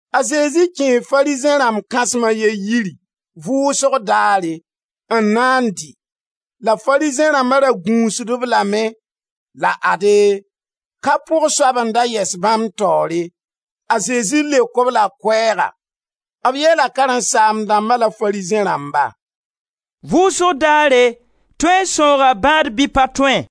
A Zezi kẽe Farizẽ rãmb kãsem a ye yiri vʋʋsg daare, n na n dɩ, la Farizẽ rãmba ra gũusd-b lame. La ade, kapʋg soab n da yɛs bãmb taoore. A Zezi leok-b la koɛɛga, b yeela karen-saam-dãmbã la Farizẽ rãmbã: «Vʋʋsg daare, tõe n sãooga bãad bɩ pa tõe?»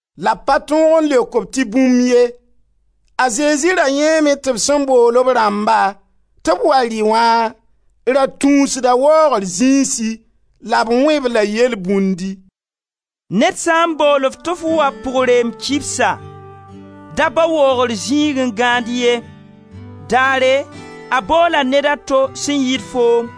La b pa tõog n leok-b tɩ bũmb ye. A Zezi ra yãeeme tɩ b sẽn bool b rãmba tɩ b wa rɩ wã ra tũusda waoogr zĩisi, la b wẽ-b-la yelbũndi: «Ned sã n bool-f tɩ f wa pʋg-reem kibsa, da bao waoogr zĩig n gãand ye, daare a boola ned a to sẽn yɩɩd foom,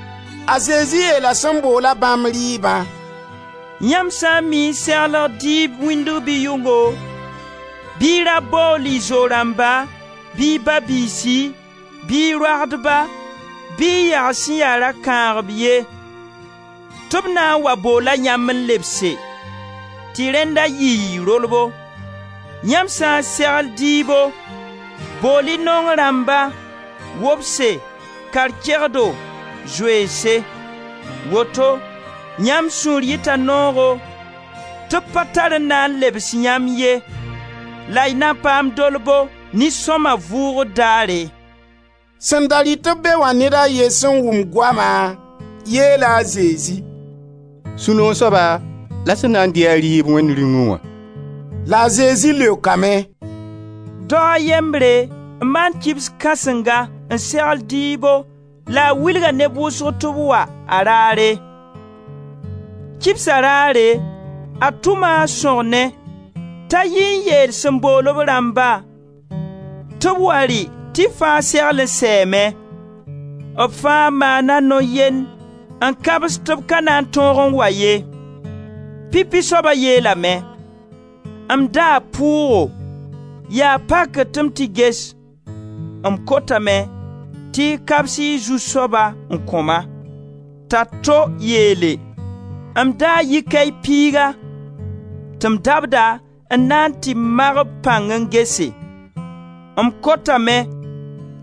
A Zezi yeela sẽn bool-a bãmb rɩɩbã: «Yãmb sã n mii n segl dɩɩb wĩndg bɩ yʋngo, bɩ y ra bool y zo-rãmba bɩ y ba-biisi, bɩ y roagdba bɩ y yags sẽn ya rakãagb ye tɩ b na n wa boola yãmb n lebse, tɩ rẽnna yɩɩ y rolbo. Yãmb sã n segl dɩɩbo, bool-y naong rãmba, wobse, kar-kegdo, zoeense. Woto yãmb sũur yita noogo tɩ b pa tar n na n lebs yãmb ye la y na paam dolbo nin-sõma vʋʋgr daare.» Sẽn da rɩt-b be wã ned a ye sẽn wʋm goama, yeela a Zezi: «Sũ-noog soaba la sẽn na n dɩ-a rɩɩb Wẽnd Rĩung wã!» La a Zezi leokame: «Dao a yembre n maan kibs kãsenga n segl dɩɩbo la a wilga neb wʋsg tɩ b wa, a raare. Kibsa raare, a tʋma a sõgne t'a yi n yeel sẽn bool b rãmba tɩ b wa rɩ tɩ fãa segl n sɛɛme. B fãa maana no-yend n kabs tɩ b ka na n tõog n wa ye. Pipi soaba yeelame: ‹M daa pʋʋgo, yaa pakr tɩ m tɩ ges; m kotame tɩ y kabs y zu-soaba n kõ-ma.› T'a to yeele: ‹M daa yikay piiga tɩ m dabda n na n tɩ mag b pãng n gese; m kotame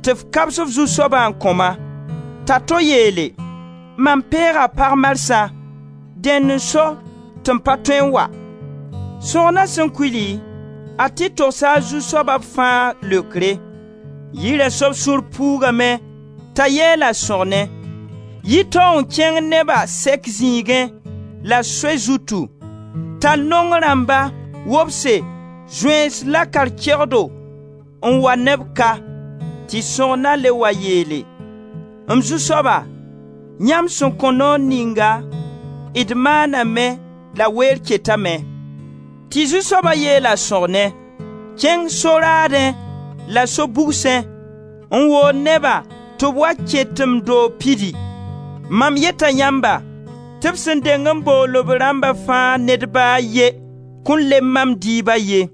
tɩ f kabs f zu-soaba n kõ-ma.› T'a to yeele: ‹Mam peega pag marsã, dẽn n so tɩ m pa tõe n wa.› Sõgna sẽn kuli, a tɩ togsa a zu-soaba b fãa leokre. Yira soab sũur puugame t'a yeel a sõgne: ‹Yi tao n kẽng neba sɛk zĩigẽ la soy zutu, tall naong rãmba, wobse, zoeens la kar-kegdo n wa ne b ka.› Tɩ sõgna le wa yeele: ‹M zu-soaba, yãmb sẽn kõ noor ninga, d maana me la weer ketame.› Tɩ zu-soaba yeel a sõgne: ‹Kẽng so-raadẽ la so-bugsẽ, n wool neba tɩ b wa kẽ tɩ m doog pidi. Man yeta yãmba, tɩ b sẽn deng n bool b rãmba fãa ned ba a ye kõn lemb mam dɩɩba ye.›»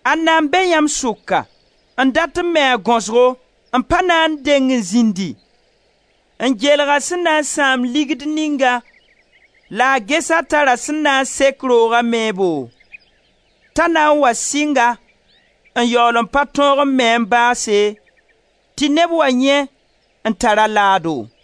Ãnna n be yãmb sʋka, n dat n me a gaosgo n pa na n deng n zĩndi, n geelg a sẽn na n sãam ligd ninga la a ges a tara sẽn na n sek rooga meebo, t'a na n wa sɩng-a, n yaool n pa tõog n me-a n baase tɩ neb wa yãe n tar-a a laado: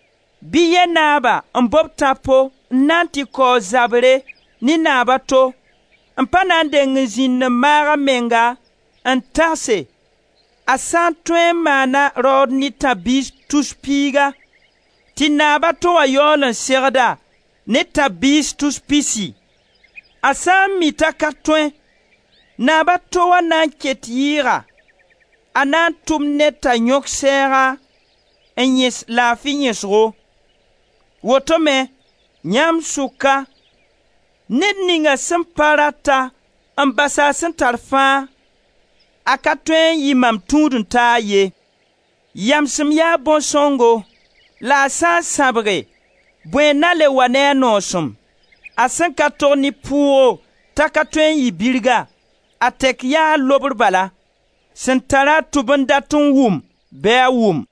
Bɩ yɛ naaba n bob tãpo n na n tɩ kaoog zabre ne naab a to, n pa na n deng n zĩnd n maag a menga n tagse a sã n tõe n maana raood ne tãb-biis tus piigã, tɩ naaba to wã yaool n segd-a ne tãb-biis tus pisi? A sã n mi t'a ka tõe, naab a to wã nan ket yɩɩga, a na tʋm ned t'a yõk sɛɛga n yẽs laafi yẽsgo. Woto me, yãmb sʋka ned ninga sẽn pa rat-a n bas a sẽn tar fãa, a ka tõe n yɩ mam tũud-n-taag ye. Yamsem yaa bõn-sõngo. La a sã n sãbge, bõe n na n le wa ne a noosem? A sẽn ka tog ne pʋʋgo t'a ka tõe n yɩ birga, a tɛk yaa lobr bala. Sẽn tara tʋb n dat n wʋm bɩ a wʋm.»